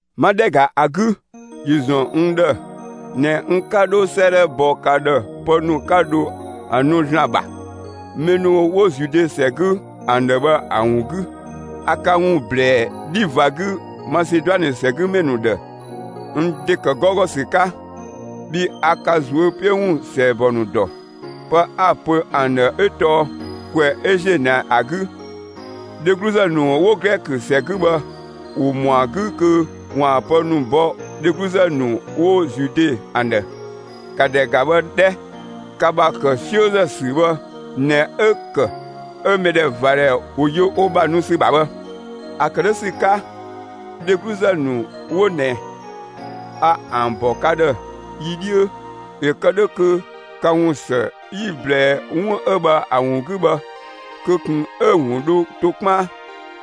'Ma ‑dhɛ ‑ga ‑a 'gü, ‑yö ‑zɔn n ‑dhë ꞊nɛ n 'ka 'dho 'sëëdhɛ bɔ ka ‑dhë pë ‑nu 'ka dho ‑a nu ‑Zlan ‑bha, mɛ ‑nu 'wo Zude ‑sɛ 'gü ‑an ‑dhë bhë ‑a ‑wun 'gü. A ka ‑wun ‑blɛɛ 'dhi ꞊va 'gü Maseduanë ‑sɛgümɛ ‑nu ‑dhë n ‑de ‑kë 'gɔugɔ 'ka, bhii a ka ꞊zuö' 'piö ‑wun ‑sɛɛbɔ ‑nu ‑dɔ. Pë 'a‑ pö ‑an ‑dhë 'ö tɔɔ: «‑Kwɛ 'ö ‑ziö ꞊nɛ ‑a 'gü, dhegluzë ‑nu 'wo Glɛkö ‑sɛ 'gü bhë ‑wo ‑mɔa 'gü kö ‑waan pë ‑nu bɔ dhegluzë ‑nu 'wo Zude ‑an ‑dhë.» ‑Ka ‑dhɛ ‑ga bhë 'dhɛ! Ka ‑bha ‑kë 'siözë ‑sü bhë ꞊nɛ 'ö‑ ‑kë 'ö mɛdhɛvadhɛ ‑wo yö wo ‑bha nu ‑sü ‑bha bhë. ‑A ‑kë 'dhö ‑sü 'ka, dhegluzë ‑nu 'wo ꞊nɛ, a ‑an ‑bɔ ka ‑dhë yi 'dhiö, ‑yö kë 'dhö kö ka ‑wun ‑së 'yi‑ ꞊blɛɛ 'wun 'ö bhë ‑a ‑wun 'gü bhë, kö ꞊kun 'ö‑ ‑wun dho to 'kpaan;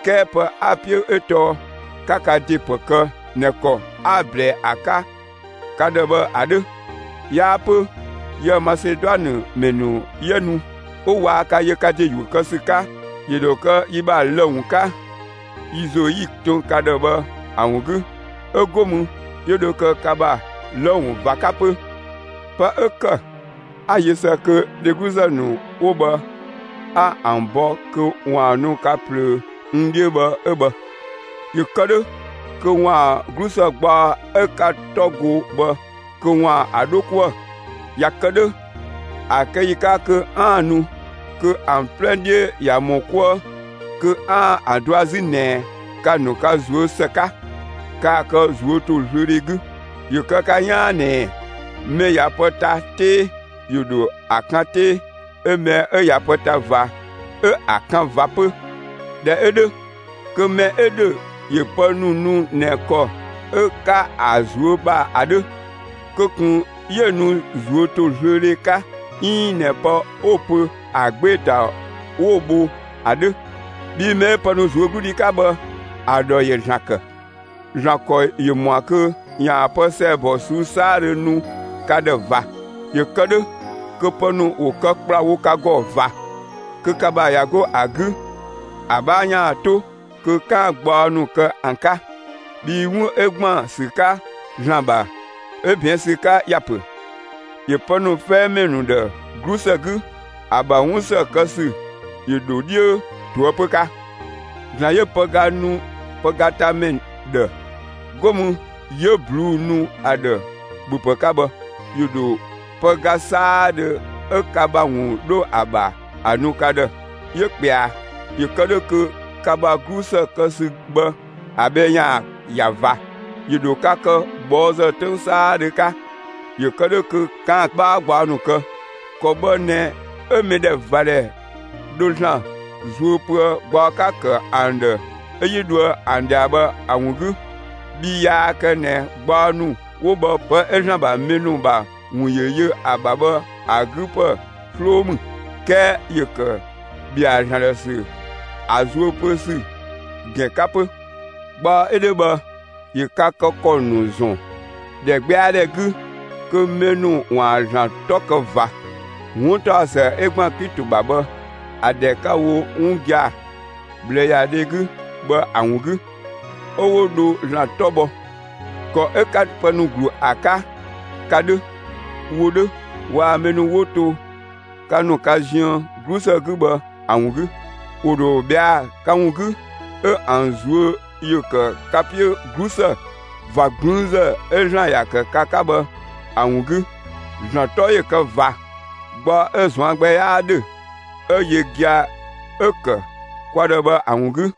'kɛɛ pë 'a‑ 'piö 'ö tɔɔ 'ka ka ‑de ‑pë kë ꞊nɛ ‑kɔ 'a‑ ꞊blɛɛ ‑a 'ka ka ‑dhë bhë ‑a 'dhö. 'Yaa 'pö, yië‑ Maseduanë ‑mɛ ‑nu 'yië nu, 'ö waa ka yö ka ‑de ‑yuö kë ‑sü 'ka, ‑yö ‑dho kë yi ‑bha lë‑ ‑wun 'ka yi ‑zo 'yi‑ tën ka ‑dhë bhë ‑a ‑wun 'gü; 'ö 'go mü 'yö dho kë ka ‑bha lë‑ ‑wun ꞊va 'ka 'pö. Pë 'ö ‑kë 'a‑ yö ‑së kö dhegluzë ‑nu 'wo bhë 'a ‑an bɔ kö ‑waan nu ka ꞊plöö n 'dhiö bhë 'ö bhë; ‑yö kë 'dhö kö ‑waan 'glusë gbaɔ 'ö 'ka‑ 'tɔ go bhë kö ‑waan ‑a 'dho 'kuë‑. ꞊Ya kë 'dhö, ‑a kë ‑yi 'ka kö 'aan‑ nu, kö ‑an 'plɛ 'dhiö ꞊ya ‑mɔ 'kuë kö 'aan‑ ‑a dɔa 'zü ꞊nɛ ka‑ ‑nu ka ꞊zuö' ‑së 'ka; kaa‑ kë ꞊zuötozlöödhe 'gü. ‑Yö kë ka 'yaan ꞊nɛɛ: Mɛ ꞊ya pë ta 'tee, ‑yö ‑dho ‑a kan 'tee; 'ö mɛ 'ö ꞊ya pë ta ꞊va, 'ö ‑a kan ꞊va 'pö. ꞊Dhɛ 'ö 'dhö, kö mɛ 'ö ‑dhö ‑yö pë ‑nu nu ꞊nɛ ‑kɔ 'ö‑ 'ka ‑a ꞊zuö' ‑bha ‑a 'dhö, kö ꞊kun 'yö‑ nu ꞊zuötozlöödhe 'ka 'iin ꞊nɛ pë 'wo‑ pö ‑a 'gbee‑ ‑ta 'wo‑ bho ‑a 'dhö. Bhii mɛ 'ö pë nu ꞊zuögludhi 'ka bhë, ‑a ‑dhɔ ‑yö ‑Zlan ‑kë. ‑Zlan ‑kɔ ‑yö ‑mɔa kö ‑yaan pë ‑sɛɛbɔ ꞊suu'‑ 'saadhö nu ka ‑dhë ꞊va, ‑yö kë 'dhö kö pë ‑nu ‑wo kë ‑kplawo ka ‑gɔ ꞊va, kö ka ‑bha ꞊ya 'go ‑a 'gü, ‑a 'bhaa ‑yaan 'to kö 'kaan‑ gbaɔ ‑nu kë ‑an 'ka. Bhii 'wun 'ö ‑gban ‑sü 'ka ‑Zlan ‑bha, 'ö ꞊bɛɛn' ‑sü 'ka ‑ya ‑pö: «‑Yö pë ‑nu 'fɛɛmɛ ‑nu ‑dhë 'glusë 'gü; ‑a ‑bha 'wun ‑së kë ‑sü ‑yö ‑dho 'dhiö ꞊toëpö 'ka.» ‑Zlan 'yö pëga nu pëgatamɛ ‑dhë, 'go mü 'yö ꞊bluu'‑ nu ‑a ‑dhë ‑bhöpë 'ka bhë, ‑yö ‑dho pëga 'saadhö 'ö ka ‑bha ‑wun 'dho ‑a ‑bha ‑a nu ka ‑dhë; 'yö ꞊kpɛa, ‑yö kë 'dhö kö ka ‑bha 'glusë kë ‑sü bhë ‑a bhɛ ‑yaan ‑ya ꞊va. ‑Yö ‑dho ka kë ꞊bhɔɔzë 'töng 'saadhö 'ka, ‑yö kë 'dhö kö 'kaan‑ 'bhaa gbaɔ ‑nu kë. ‑Kɔ bhë ꞊nɛ 'ö mɛdhɛvadhɛ dho ‑Zlan zuö pöë gbaɔ 'ka‑ ‑kë ‑an ‑dhë 'ö 'yi dhoë ‑an ꞊dhia bhë ‑a ‑wun 'gü. Bhii yaa kë ꞊nɛ gbaɔ ‑nu 'wo bhë pë 'ö ‑Zlan ‑bha mɛ ‑nu ‑bha ‑wun ‑yö yö ‑a ‑bha bhë ‑a 'gü ‑pë 'sloo ‑mü, 'kɛɛ ‑yö ‑kë ‑bhɛa ‑Zlan ‑dhë ‑sü ‑a zuö pö ‑sü ‑gɛn 'ka 'pö. Gbaɔ 'ö 'dhö bhë ‑yö ka kë ‑kɔ ‑nu ‑zɔn ‑dhɛgbɛadhɛ 'gü kö mɛ ‑nu ‑waan ‑Zlan 'tɔ kë ꞊va, 'wuntaɔsë 'ö ‑gban Klito ‑bha bhë, ‑a ‑dhɛ 'ka‑ wo 'wun gia‑ ꞊bhlëyadhe 'gü bhë ‑a ‑wun 'gü; 'ö 'wo dho ‑Zlan 'tɔ bhɔ, ‑kɔ 'ö 'ka pë ‑nu ‑glu ‑a 'ka, ka 'dhö, wo 'dhö waa‑ mɛ ‑nu 'wo to ka ‑nu ka ziën 'glusë 'gü bhë ‑a ‑wun 'gü. ‑Wo ‑dho ꞊bhɛa'‑ ka ‑wun 'gü, 'ö ‑an ꞊zuö' ‑yö ‑kë ka 'piö 'glusë ꞊va 'gblüünzë 'ö ‑Zlan ‑ya ‑kë ka 'ka bhë ‑a ‑wun 'gü. ‑Zlan 'tɔ ‑yö kë ꞊va gbaɔ 'ö‑ ꞊zuan' gbɛ 'yaa 'dhö, 'ö yö gia‑ 'ö‑ ‑kë kwa ‑dhë bhë ‑a ‑wun 'gü.